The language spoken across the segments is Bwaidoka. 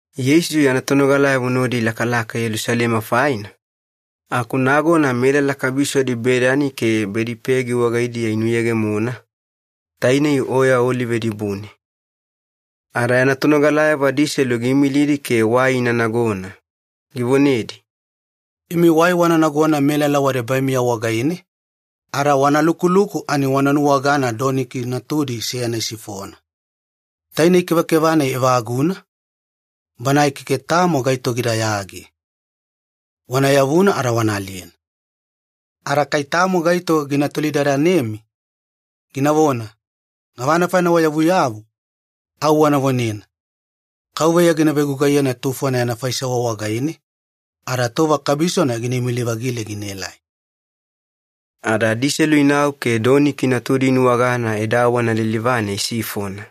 Yeisu yana tonogalayavo nodi ilakalaka Yelusalema faina, aku nagona melala kabisodi Bedani ke Bedipegi wagaidiya inuyegemona, tainei Oya Olive dibune. Ada yana tonogalayavo adiselu giimilidi ke wai ina nagona, givonedi, “Imi wai wana nagona melala wadebaimiya wagaine, ada wana lukuluku ani wana nuwagana doniki natudi seyana isifona. Tainei kevakeva-nai evaguna, banae keke tamo gaito gidayage. Wana yavuna ada wana aliyena. Ada kai tamo gaito gina tolidadanemi, ginavona, ‘Gavana faina wayavuyavu?’ au wana vonena, ‘Kauveya gina vegugaiyena tufona yana faisewa wagaine, ada tova kabisona gina imili-vagile ginaelai.’” Ada adiselu inau ke doniki natudi inuwagana edawana lilivane isifona.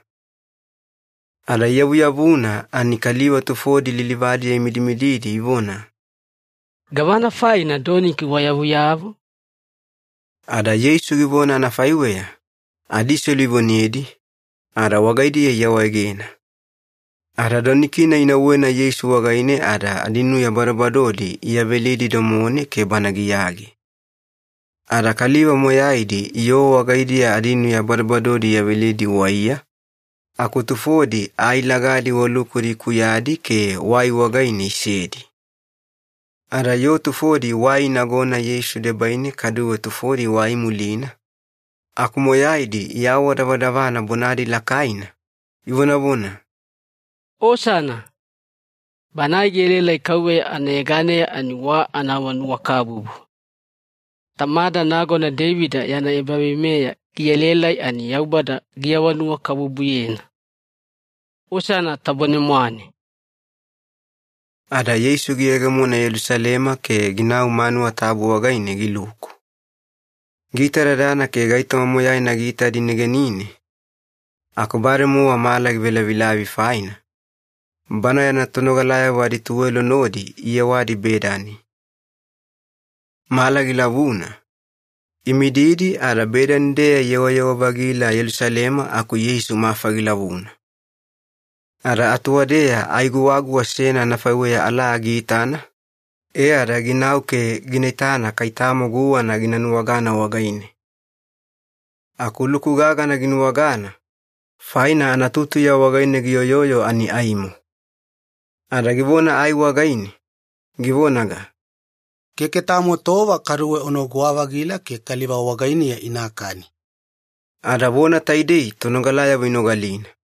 Ada iyavuyavuna ani kaliva tufodi lilivadiya imidimididi ivona, “Gavana faina doniki wayavuyavu?” Ada Yeisu givona anafaiweya, adiselu ivonedi, ada wagaidiya iawaegena. Ada doniki-nai inauwena Yeisu wagaine ada adinuya badobadodi iyavelidi domone ke Bana giyage. Ada kaliva moyaidi yoo wagaidiya adinuya badobadodi iyavelidi waiya, aku tufodi ai lagadi wa lukudi ikuyadi ke wai wagaine isedi. Ada yoo tufodi wai inagona Yeisu debaine kaduwe tufodi wai imulina, aku moyaidi iawadavadavana bonadi lakaina, ivonavona, “Osana! Banae gielaelai KAUVEYA anayeganeya ani wa anaawanuwakabubu! Tamada nagona Deivida yana ebaveimeya gielaelai ani Yaubada giawanuwakabubuyena! Osana tabone-mwane!” Ada Yeisu giyegemona Yelusalema ke ginau manuwa tabu wagaine giluku. Giitadadana ke gaitoma moyaina giitadi negenine aku bademowa mala givelavilavi faina, Bana yana tonogalayavo adituwelo nodi iyewadi Bedani. Mala gilavuna, imididi ada Bedani-deya iyewayewa-vagila Yelusalema aku Yeisu mafa gilavuna. Ada atuwadeya ai guwaguwa seyana anafaiweya alaa giitana, e ada ginau ke gina itana kai tamo guwana gina nuwagana wagaine. Aku luku gagana ginuwagana, faina anatutuya wagaine giyoyoyo ani aimo. Ada givona ai wagaine, givonaga, “Keke tamo tova kaduwe unaguwa-vagila ke kaliva wagainiya inakani.” Ada vona taidei tonogalayavo inogalina.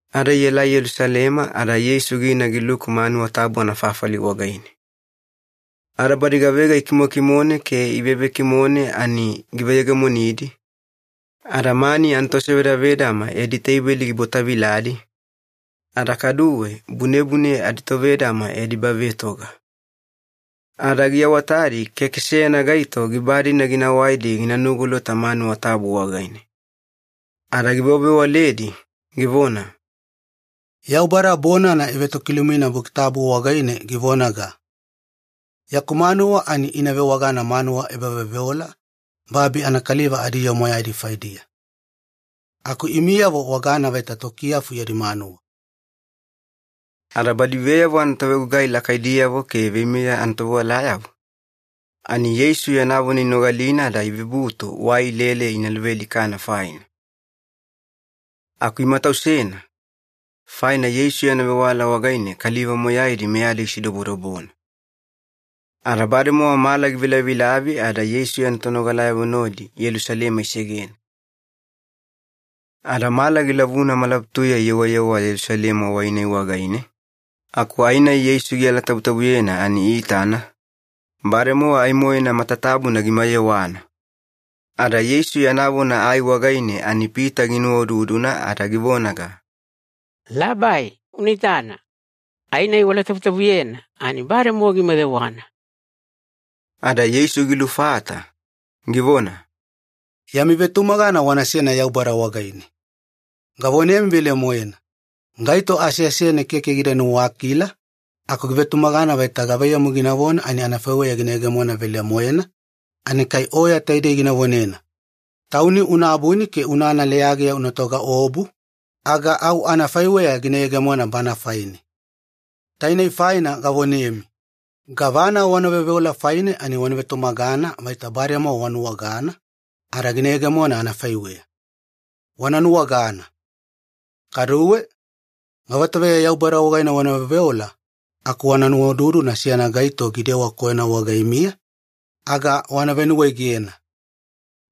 Ada ielai Yelusalema ada Yeisu gina giluku manuwa tabu anafafali wagaine. Ada badi gavega ikimokimone ke ivevekimone ani giveyegemonidi, ada mani anatosevedavedama yadi teibeli gibwataviladi, ada kaduwe bunebune aditovedama yadi ebavetoga. Ada giawatadi keke seyana gaito giba-dina gina waidi gina nugolota manuwa tabu wagaine. Ada givewavewaledi, givona, “Yaubada bonana ivetokilumina Buki Tabu wagaine givonaga, ‘Yaku manuwa ani ina vewagana manuwa ebaveoveola babi anakaliva adiyoo moyaidi faidiya.’ ‘Aku imiyavo wagana vaita tokiyafu yadi manuwa.’” Ada badi veyavo anatovegugai lakaidiyavo ke veimeya anatovewalayavo, ani Yeisu yana vona inogalina ada ivebutu wai ilele ina luvealikana faina. Aku imatausena, faina Yeisu yana vewala wagaine kaliva moyaidi meyadi gisidobodobona. Ada bademowa mala givelavilavi ada Yeisu yana tonogalayavo nodi Yelusalema isegena. Ada mala gilavuna malabutuya iyewayewa Yelusalema wai-nai wagaine aku ai-nai Yeisu gialatabutabuyena ani iitana, bademowa ai-moena matatabuna gimayewana. Ada Yeisu yana vona ai wagaine ani Pita ginuwaududuna ada givonaga, “Labai, una itana! Ai-nai ualatabutabuyena ani bademowa gimayewana!” Ada Yeisu gilufata, givona, “Yami vetumagana wanasena Yaubada wagaine. Gavonemi velemoena, gaito aseasene keke gida nuwakila, aku givetumagana vaita gavaiyamu ginavona ani anafaiweya gina yegemona velemoena, ani kai oya taidei gina vonena, ‘Tauni una abuni ke unana leyageya una togaobu’, aga au anafaiweya gina yegemona bana faine. Tainei faina gavonemi, gavana wana veoveola faine ani wana vetumagana vaita bademowa wanuwagana, ada gina yegemona anafaiweya. Wana nuwagana. Kaduwe, gavatoveya Yaubada wagaine wana veoveola aku wana nuwaududuna seyana gaito gidewa koyona wagaimiya, aga wana venuwaegena.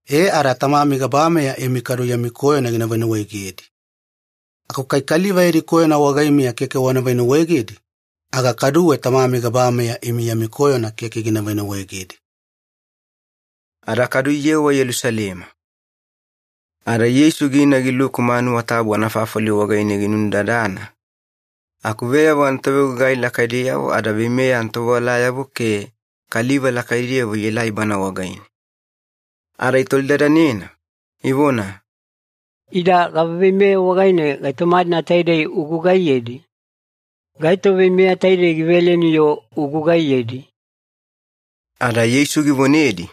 E ada Tamami gabameya imi kaduwe yami koyona gina venuwaegedi. Aku kai kaliva yadi koyona wagaimiya keke wana venuwaegedi, aga kaduwe Tamami gabameya imi yami koyona keke gina venuwaegedi.” Ada kadu iyewa Yelusalema. Ada Yeisu gina giluku manuwa tabu anafafali wagaine ginunudadana, aku veyavo anatovegugai lakaidiyavo ada veimeya anatovewalayavo ke kaliva lakaidiyavo ielai Bana wagaine. Ada itolidadanena, ivona, “Ida gava veimeya wagaine gaitoma-dina taidei ugugaiyedi? Gaito veimeya taidei giveleni-yo ugugaiyedi?” Ada Yeisu givonedi,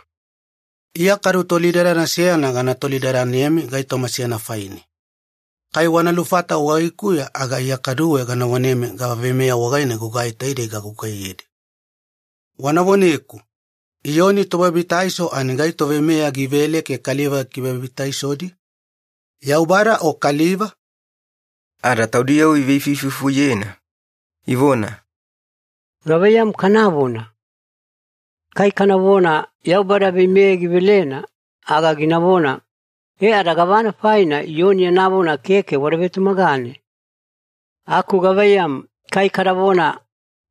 “Iya kadu tolidadana seyana gana tolidadanemi gaitoma seyana faine. Kai wana lufata wagaikuya aga Iya kaduwe gana vonemi gava veimeya wagaine gugai taidei gagugaiyedi. Wana voneku, Iyoni Tobabitaiso ani gaito veimeya givele ke kaliva gikivebabitaisodi? Yaubada o kaliva?” Ada taudiyavo iveifuifufuyena, ivona, “Gavaiyamu kanavona? Kai kanavona ‘Yaubada veimeya givelena,’ aga ginavona, ‘E ada gavana faina Iyoni yana vona keke wada vetumagane?’ Aku gavaiyamu, kai kadavona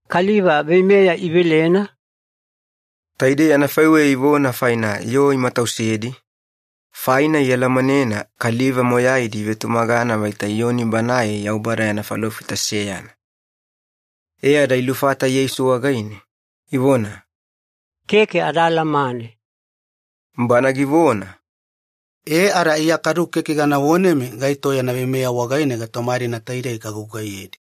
‘Kaliva veimeya ivelena’?” Taidei anafaiweya ivona faina yoo imatausedi, faina ialamanena kaliva moyaidi ivetumagana vaita Iyoni banae Yaubada yana falofita seyana. E ada ilufata Yeisu wagaine, ivona, “Keke ada alamane.” Bana givona, “E ada Iya kadu keke gana vonemi gaito yana veimeya wagaine gaitoma-dina taidei gagugaiyedi.”